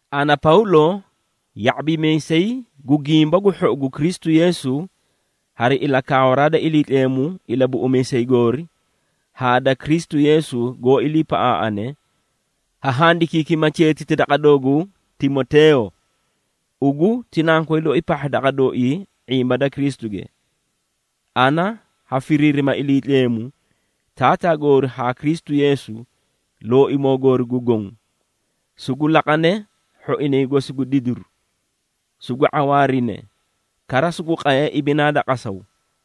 Ana Pawlo, ya⁄abimiisay gu Gimba gu Hhou gu Kristu Yeesu hari ilakaawaraa da Iliitleemu Ilabuꞌumiisay goori haa da Kristu Yeesu goó iliipaꞌaaꞌane, ha handikiikima cheetiti daqa doogu Timoteeyo. Ugu ti nankoy loi pahha daqa dooii ⁄imba da Kristuge. Ana ha firiirima Iliitleemu, Taataa goori haa Kristu Yeesu, Looimoo goori gu Goõ, sugu laqane hhoinay gosi gu didiru, sugu ⁄awaarine, kara sugu qaye ibinaa da qasaw.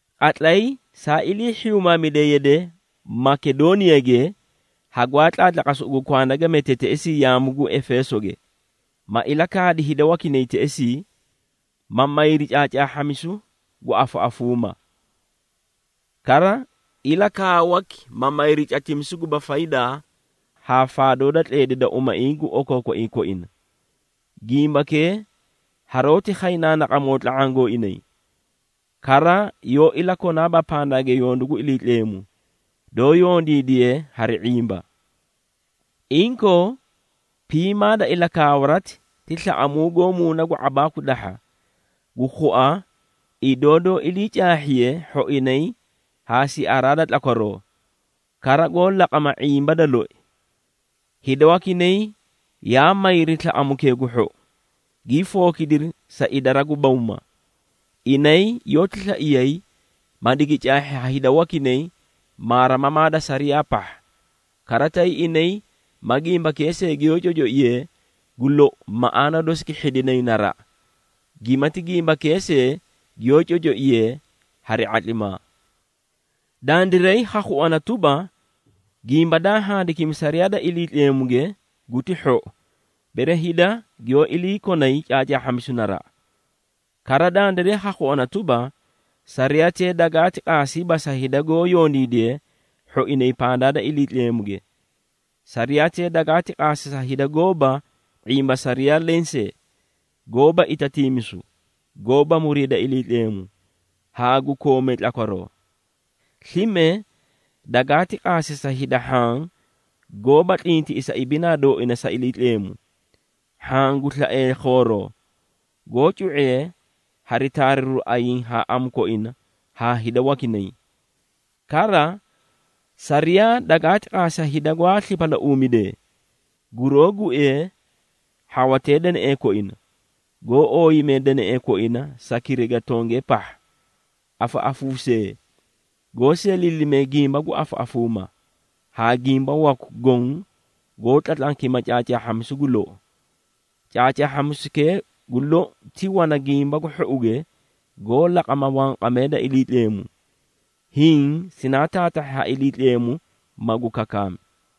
Qatlay saa ilii hhiyuumaamide yade Makedooniyage, hagwaa tlaatlaqasi ugu kwanda ga mete teꞌesii yaamu gu Efeesoge, ma ilakaadi hida wakinay teꞌesii, ma mayri caacaahhamisu gu afaꞌafuumaa. Kara ilakaawaki, ma mayri catimisu guba faydaa haa faadoo da tleedi da umaiĩ gu okookoiĩ koina. Gimbakee haroóti khay naanaqamoo tla⁄aã gooinay, kara yoó ilakonaaba pandaage yondu gu Iliitleemu, doó yondiidiye hari ⁄imba. Inkoo, piimaa da ilakaawarati, ti slaꞌamuu goó muuna gu ⁄abaaku dahha, gu khua idoo doó iliicaahhiye hhoinay haa siaraa da tlakwaroo, kara goó laqama ⁄imba da loi. Hida wakinay yaa mayri slaꞌamukee gu hhou, gii fookidiri sa idara gu bawma. Inay yoóti slaiyay, ma digi caahhi ha hida wakinay maarimamaa da sariyaa pahha. Kara tay inay ma gimbakee see giyoó cocoiyeei, gu lou maꞌaana dosi gi hhidinay naraꞌa, gimati gimbakee see giyoó cocoiyee hari ⁄atlimaa. Dandiray ha khuana tuba, gimba daa handikimi sariyaa da Iliitleemuge guti hhou, bere hida giyoó iliikonay caacaahhamisu naraꞌa. Kara dandiray ha khuana tuba, sariyatee dagaati qaasiiba sa hida goó yondiidee hhoinay pandaa da Iliitleemuge. Sariyatee dagaati qaasi sa hida goóba ⁄imba sariyaa lensee, goóba itatiimisu, goóba muriida Iliitleemu, haa gu koomee tlakwaroo. Slime, dagaati qaasi sa hida hhaã goóba tlintiꞌisa ibinaa dooina sa Iliitleemu, hhaã gu slaee khooroti, goó cu⁄ee hari taariru ayiĩ haa amu koina haa hida wakinay. Kara sariyaa dagaati qaasi sa hida gwaa slipalauumidee, guroó guee hhawatee deneꞌee koina, goó ooyimee deneꞌee koina sa kiriga tongee pahha, afaꞌafuusee, goó seeliilimee gimba gu afaꞌafuumaa, haa gimba waku goõ goó tlatlankima caacaahhamisu gu lou. Caacaahhamisukee gu lou ti wana Gimba gu Hhouge goó laqama wanqamee da Iliitleemu, hiĩ sinaa taatahhi ha Iliitleemu magu kakaami.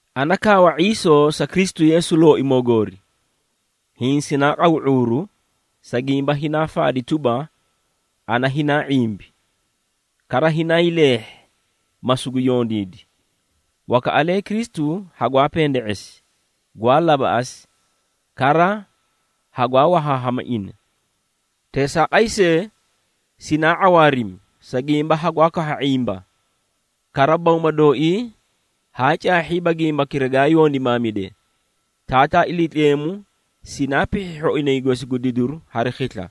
Ana kaawa ⁄iisoo sa Kristu Yeesu Looimoo goori, hiĩ sinaa qaw ⁄uuru, sa gimba hinaa faadi tuba, ana hinaa ⁄imbi, kara hinaa hiileehhi, ma sugu yondiidi. Wakaꞌalee Kristu hagwaa pende⁄esi, gwaa labaꞌasi, kara hagwaa wahaahama ina. Teesaaqay see, sinaa ⁄awaarimi, sa gimba hagwaa kahha ⁄imba, kara bawma dooii haa caahhiiba gimbakira gaa yondimaamide. Taataa Iliitleemu sinaa pihhi hhoinay gosi gu didiru hari khisla.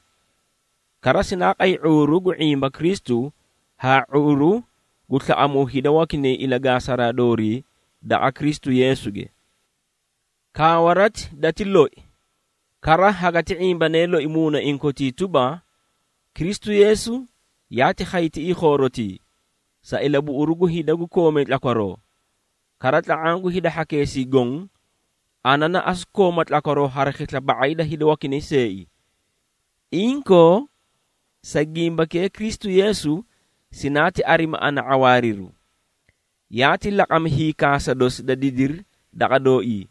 Kara sinaa qay ⁄uuru gu ⁄imba Kristu haa ⁄uuru gu slaꞌamuu hida wakinay ilagaasaraa doorii daqa Kristu Yeesuge. Kaawarati dati loi, kara hagati ⁄imbane loi muunaiĩ kotii tuba, Kristu Yeesu yaati khay tiꞌii khoorotii, sa ilabuꞌuru gu hida gu koomee tlakwaroo. Kara tla⁄aã gu hida hhakeesii goõ, ana na asu kooma tlakwaroo hari khisla ba⁄ay da inay seei! Inkoo, sa gimbakee Kristu Yeesu sinaati arimi ana ⁄awaariru. Yaati laqami hiikaasa dosi da didiri daqa dooii,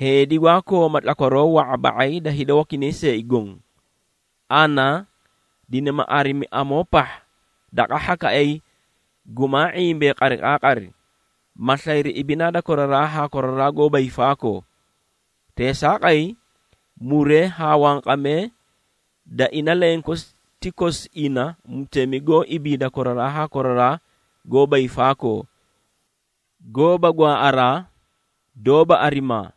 heedi gwaa kooma tlakwaroo wa⁄a ba⁄ay da hida wakinay see goõ. Ana dinima arimi amoo pahha daqa hhakaꞌay gumaa ⁄imbee qariqaaqari, ma slayri ibinaa da koraraa haa koraraa goóba hiifaakoo. Teesaaqay, muree haa wanqamee da ina lenkosi ti kosi ina Mutemi goó ibiida koraraa haa koraraa goóba hiifaakoo, goóba gwaaꞌaraa, doóba arimaa,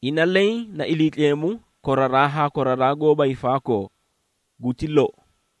ina leẽ na Iliitleemu koraraa haa koraraa goóba hiifaakoo! Guti lou.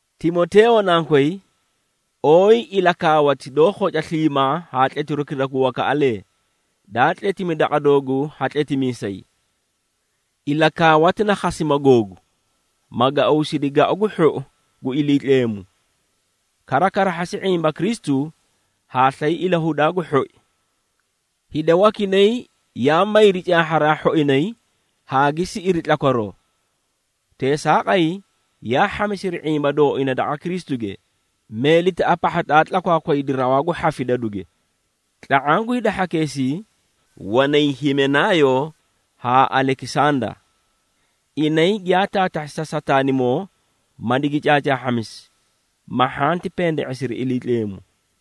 Timoteeyo nankoy, ooyi ilakaawati doó khoca sliimaa haa tletirukira gu wakaꞌalee, daa tletimi daqa dooguu ha tletimiisay. Ilakaawati na khasima googu, ma gauusidi gau gu hhou gu Iliitleemu. Kara karahhasi ⁄imba Kristu haa slay ilahudaa gu hhoi. Hida wakinay yaa mayri caahharaa hhoinay haa gi siꞌiri tlakwaroo, teesaaqay yaa hhamisiri ⁄imba dooina daqa Kristuge, meelitaꞌa pahha daa tlakwaakwadi rawaa gu hhafidaduge. Tla⁄aã gu hida hhakeesii wanay Himenaayo haa Alekisanda. Inay giyaa taatahhi sa Sataanimoo, ma digi caacaahhamisi, ma hhanti pende⁄esiri Iliitleemu.